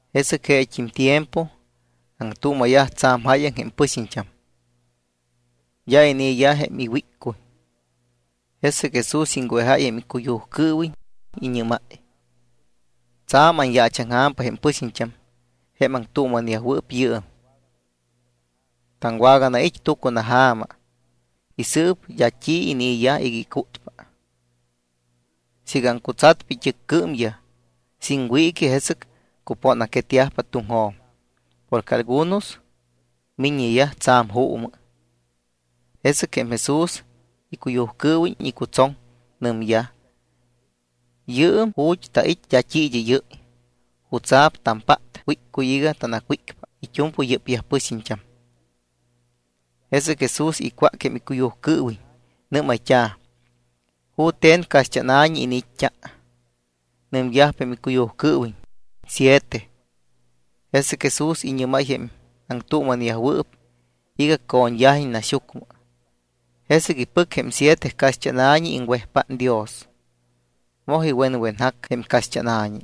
Jesɨc jeet́im tiempo aŋtuuma̱yaj tsa̱m jáyaŋ jém pɨxiñt́am. D́a inii̱yaj jém iwíccuy. Jesɨc Jesús iŋwejáy jém icuyujcɨɨwiñ. Iñɨ́máy: —Tsa̱m aŋyaachaŋja̱mpa jém pɨxiñt́am jém aŋtuuma̱neyajwɨɨp yɨɨm. Taŋwaganait́ tucunaja̱ma y sɨɨp d́a t́i inii̱yaj iga icútpa. Siiga aŋcutsatpa it́ɨcmɨyaj sin wiiqui, jesɨc cupóna̱quetyajpa tuŋjo̱m porque algunos miññeyaj tsa̱m juumɨ. Jesɨc jém Jesús icuyujcɨɨwiñ icutsoŋ, nɨmyaj: —Yɨɨm ju̱t́ tait́ d́a t́i id́ɨ́yɨ́y. ¿Jutsa̱p tampát wíccuy iga tanacwícpa it́u̱mpɨy yɨ́pyaj pɨxiñt́am? Jesɨc Jesús icwác jém icuyujcɨɨwiñ. Nɨ́mayt́a̱: —¿Jute̱n caxt́ána̱ñi iniit́t́a? Nɨmyajpa jém icuyujcɨɨwiñ: —Siete. Jesɨc Jesús iñɨ́máy jém aŋtuuma̱neyajwɨɨp iga co̱ñyajiñ naxyucmɨ. Jesɨc ipɨc jém siete caxt́ána̱ñi, iŋwejpát Dios, moj iwenwenjac jém caxt́ána̱ñi.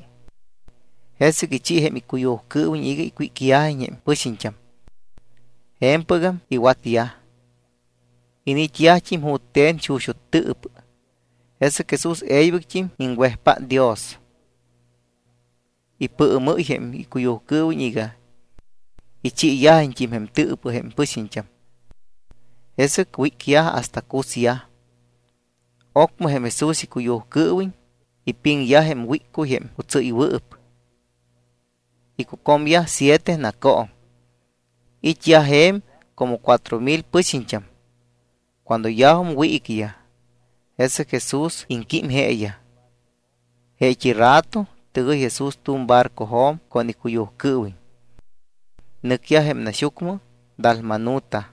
Jesɨc ichi jém icuyujcɨɨwiñ iga icwícyajiñ jém pɨxiñt́am. Je̱mpɨgam iwatyaj. Iniit́yajt́im jute̱n xuxut́ tɨɨpɨ. Jesɨc Jesús e̱ybɨct́im iŋwejpát Dios. Ipɨɨmɨ́y jém icuyujcɨɨwiñ iga ichiiyajiñt́im jém tɨɨpɨ jém pɨxiñt́am. Jesɨc wícyaj hasta cusyaj. Ocmɨ jém Jesús icuyujcɨɨwiñ ipiŋyaj jém wíccuy jém cutsɨ́ywɨɨp. Icucomyaj siete nacooŋ. It́yaj je̱m como cuatro mil pɨxiñt́am. Cuando yajum wiiquiyaj, jesɨc Jesús iŋquím jeeyaj. Jeet́i rato tɨgɨy Jesús tu̱m barcojo̱m con icuyujcɨɨwiñ. Nɨcyaj jém naxyucmɨ Dalmanuta.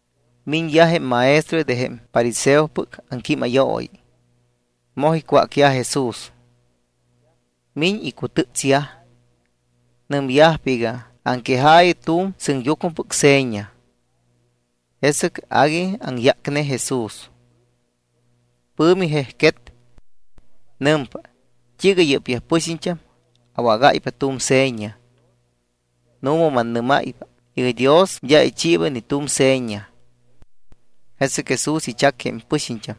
Miñyaj jém maestroyaj de jém fariseopɨc aŋquímayooyi. Moj icwácyaj Jesús. Miñ icutɨ́tsyaj. Nɨmyajpa iga: “Aŋquejaayɨ tu̱m sɨŋyucmɨpɨc seña.” Jesɨc agui aŋyácne Jesús. Pɨ̱mi jejquet. Nɨmpa: —¿T́iiga yɨ́pyaj pɨxiñt́am awágáypa tu̱m seña? Nu̱ma mannɨ́máypa iga Dios d́a ichiiba ni tu̱m seña. Jesɨc Jesús ichac jém pɨxiñt́am,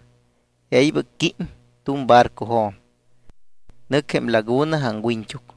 e̱ybɨc quím tu̱m barcojo̱m. Nɨc jém laguna aŋwiñt́uc.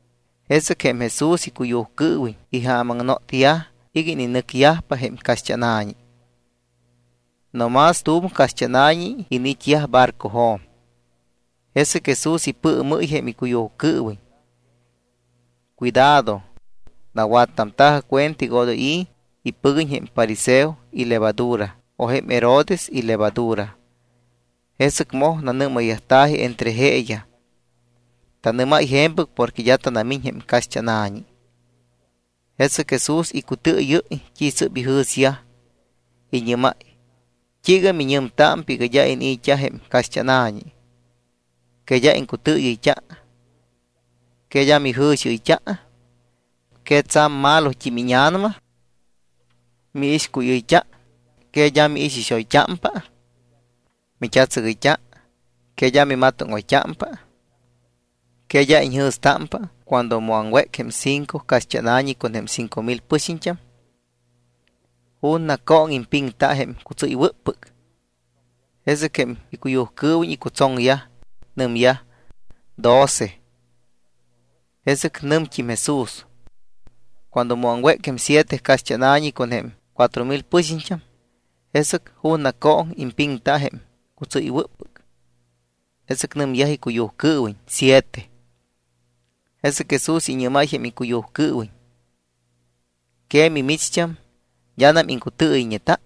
Jesɨc jém Jesús icuyujcɨɨwiñ ijaamaŋnotyaj iga ininɨcyajpa jém caxt́ána̱ñi. No más t́u̱m caxt́ána̱ñi iniit́yaj barcojo̱m. Jesɨc Jesús ipɨɨmɨ́y jém icuyujcɨɨwiñ: —Cuidado. Nawattamta̱jɨ cuenta iga odoy impɨguiñ jém fariseoyaj ilevadura o jém Herodes ilevadura. Jesɨc moj nanɨ́mayyajta̱ji entre jeeyaj: —Tanɨ́máy je̱mpɨc porque d́a tanamiñ jém caxt́ána̱ñi. Jesɨc Jesús icutɨɨyɨ́y t́i sɨ́p ijɨ̱syaj, iñɨ́máy: —¿T́iiga miñɨmtámpa iga d́a inii̱t́a jém caxt́ána̱ñi? ¿Que d́a iŋcutɨɨyɨyt́a? ¿Que d́a mijɨ̱xiɨyt́a? ¿Que tsa̱m malot́im íña̱nama? Miixcuyɨyt́a, ¿que d́a miixixoyt́ámpa? Mit́atsɨgɨyt́a, ¿que d́a mimatóŋoyt́ámpa? ¿Que d́a iñjɨ̱stámpa cuando mu aŋwéc jém cinco caxt́ána̱ñi con jém cinco mil pɨxiñt́am? ¿Ju̱na cooŋ impiŋta jém cutsɨ́ywɨ́ppɨc? Jesɨc jém icuyujcɨɨwiñ icutsoŋyaj. Nɨmyaj: —Doce. Jesɨc nɨmt́im Jesús: —Cuando mu aŋwéc jém siete caxt́ána̱ñi con jém cuatro mil pɨxiñt́am, ¿jesɨc ju̱na cooŋ impiŋta jém cutsɨ́ywɨ́ppɨc? Jesɨc nɨmyaj icuyujcɨɨwiñ: —Siete. Jesɨc Jesús iñɨ́máy jém icuyujcɨɨwiñ: —¿Que mimicht́am d́anam iŋcutɨɨyɨyñeta?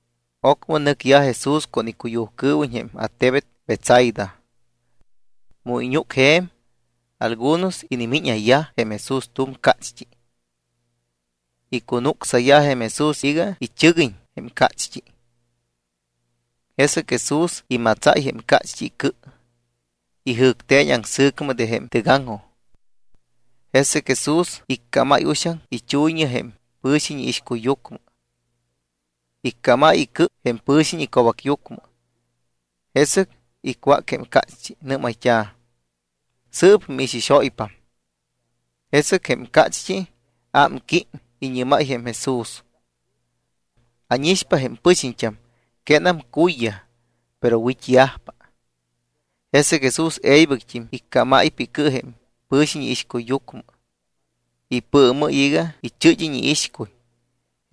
Ocmɨ nɨcyaj Jesús con icuyujcɨɨwiñ jém attebet Betsaida. Mu iñúcyaj je̱m, algunos inimíñayyaj jém Jesús tu̱m cácht́i. Icunucsayyaj jém Jesús iga ichɨguiñ jém cácht́i. Jesɨc Jesús imatsáy jém cácht́i icɨ, ijɨ̱cte̱ñ aŋsɨ̱cmɨ de jém tɨgaŋjoj. Jesɨc Jesús iccámáy uxaŋ ichuyñɨ jém pɨ̱xiñ iixcuyyucmɨ. Iccámáy icɨ jém pɨ̱xiñ ico̱bacyucmɨ. Jesɨc icwác jém cácht́i. Nɨ́mayt́a̱: —¿Sɨɨp miixixóypam? Jesɨc jém cácht́i ámquím. Iñɨ́máy jém Jesús: —Ánixpa jém pɨxiñt́am quénam cuyyaj, pero wit́yajpa. Jesɨc Jesús e̱ybɨct́im iccámáypa icɨ jém pɨ̱xiñ iixcuyyucmɨ, ipɨɨmɨ́y iga ichɨ́d́iñ iixcuy.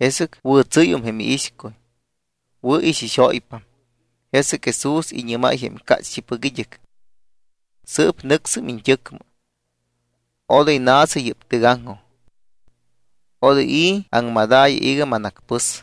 Jesɨc wɨ̱tsɨ́yum jém iixcuy, wɨ̱ ixixóypam. Jesɨc Jesús iñɨ́máy jém cácht́ipɨc id́ɨc: —Sɨɨp nɨcsɨm iñt́ɨcmɨ. Odoy na̱sɨ yɨ́p tɨgaŋjoj. Odoy i̱ aŋmadaayɨ iga manacpɨs.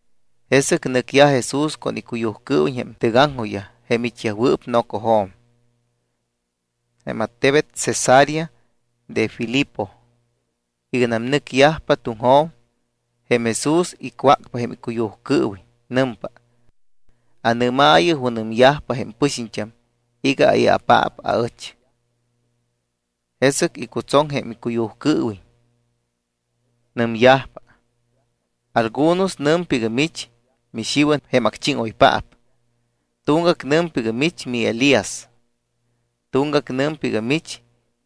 Jesɨc nɨcyaj Jesús con icuyujcɨɨwiñ jém tɨgaŋjojyaj jém it́yajwɨɨp nocojo̱m jém attebet Cesarea de Filipo. Iganam nɨcyajpa tuŋjo̱m, jém Jesús icwácpa jém icuyujcɨɨwiñ. Nɨmpa: —Anɨ́maayɨ junɨmyajpa jém pɨxiñt́am iga ai̱apaap aɨch. Jesɨc icutsoŋyaj jém icuyujcɨɨwiñ. Nɨmyajpa: —Algunos nɨmpa iga mich miXiwan jém acchíŋoypaap. Tuŋgac nɨmpa iga mich miElías. Tuŋgac nɨmpa iga mich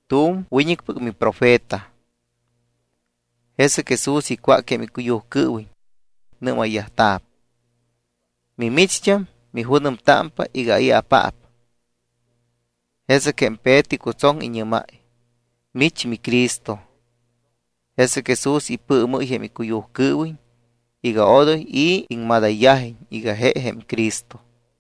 tu̱m wiñɨcpɨc miprofeta. Jesɨc Jesús icwác jém icuyujcɨɨwiñ. Nɨ́mayyajta̱p: —¿Mimicht́am, mijunɨmtámpa iga ai̱apaap? Jesɨc jém Peto icutsoŋ. Iñɨ́máy: —Mich miCristo. Jesɨc Jesús ipɨɨmɨ́y jém icuyujcɨɨwiñ iga odoy i̱ iŋmadayyajiñ iga je jém Cristo.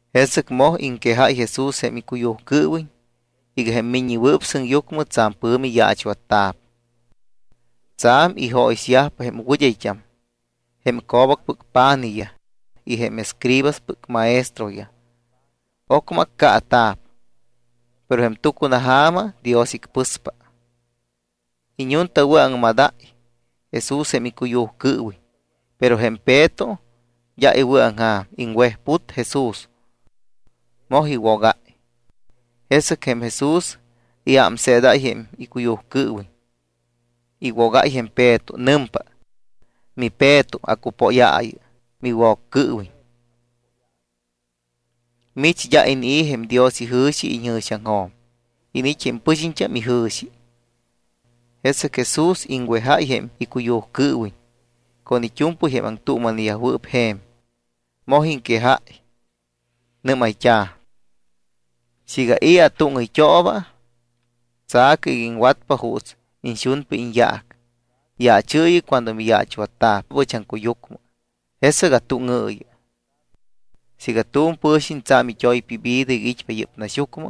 Jesɨc moj iŋquejáy Jesús jém icuyujcɨɨwiñ iga jém Miññewɨɨp Sɨŋyucmɨ tsa̱m pɨ̱mi yaachwatta̱p. Tsa̱m ijóyixyajpa jém wɨd́ayt́am, jém co̱bacpɨc pa̱nijyaj y jém escribaspɨc maestroyaj. Ocmɨ accaata̱p, pero jém tucunaja̱ma Dios icpɨspa. Iñuntawɨ̱aŋmadáy Jesús jém icuyujcɨɨwiñ. Pero jém Peto d́a iwɨ̱aŋja̱m, iŋwejput Jesús, moj iwogáy. Jesɨc jém Jesús iámseedáy jém icuyujcɨɨwiñ, iwogáy jém Peto. Nɨmpa: —MiPeto, acupóyaayɨ miWoccɨɨwiñ. Mich d́a inii̱ jém Dios ijɨ̱xi iñjɨ̱xiaŋjo̱m. Iniit́ jém pɨxiñt́am ijɨ̱xi. Jesɨc Jesús iŋwejáy jém icuyujcɨɨwiñ con it́u̱mpɨy jém aŋtuuma̱neyajwɨɨp je̱m. Moj iŋquejáy. Nɨ́mayyajta̱: —Siiga i̱ atúŋɨyt́ooba, tsa̱cɨ iga iŋwatpa juuts iñxunpa iñyaac, yaachɨɨyɨ cuando miyaachwatta̱p ɨch aŋcuyucmɨ, jesɨc atúŋɨɨyɨ. Siiga tu̱m pɨ̱xiñ tsa̱m it́oypa ivida iga it́pa yɨ́p naxyucmɨ,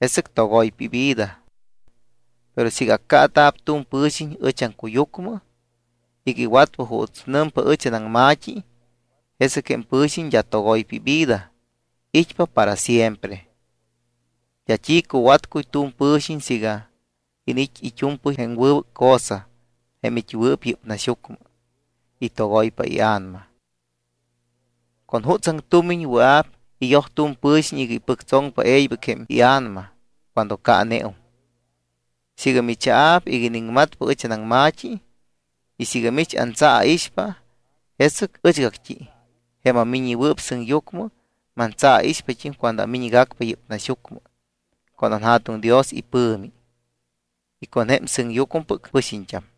jesɨc togoypa jém ivida. Pero siiga accaata̱p tu̱m pɨ̱xiñ ɨch aŋcuyucmɨ iga iwatpa juuts nɨmpa ɨch anaŋma̱t́i, jesɨc jém pɨ̱xiñ d́a togoypa ivida, it́pa para siempre. D́a t́i cuwatcuy tu̱m pɨ̱xiñ siiga iniit́ it́u̱mpɨy jém wɨbɨc cosa jém it́wɨɨp yɨ́p naxyucmɨ y togoypa ia̱nama. ¿Con jutsaŋ tumiñ wɨa̱p iyoj tu̱m pɨxiñ iga ipɨctsoŋpa e̱ybɨc jém ia̱nama cuando caaneum? Siiga michaa̱p iga iniŋmatpa ɨch anaŋma̱t́i y siiga mich antsaaixpa, jesɨc ɨchgact́i, jém aMiññewɨɨp Sɨŋyucmɨ, mantsaaixpat́im cuando amiñgacpa yɨ́p naxyucmɨ con anJa̱tuŋ Dios ipɨ̱mi y con jém sɨŋyucmɨpɨc pɨxiñt́am.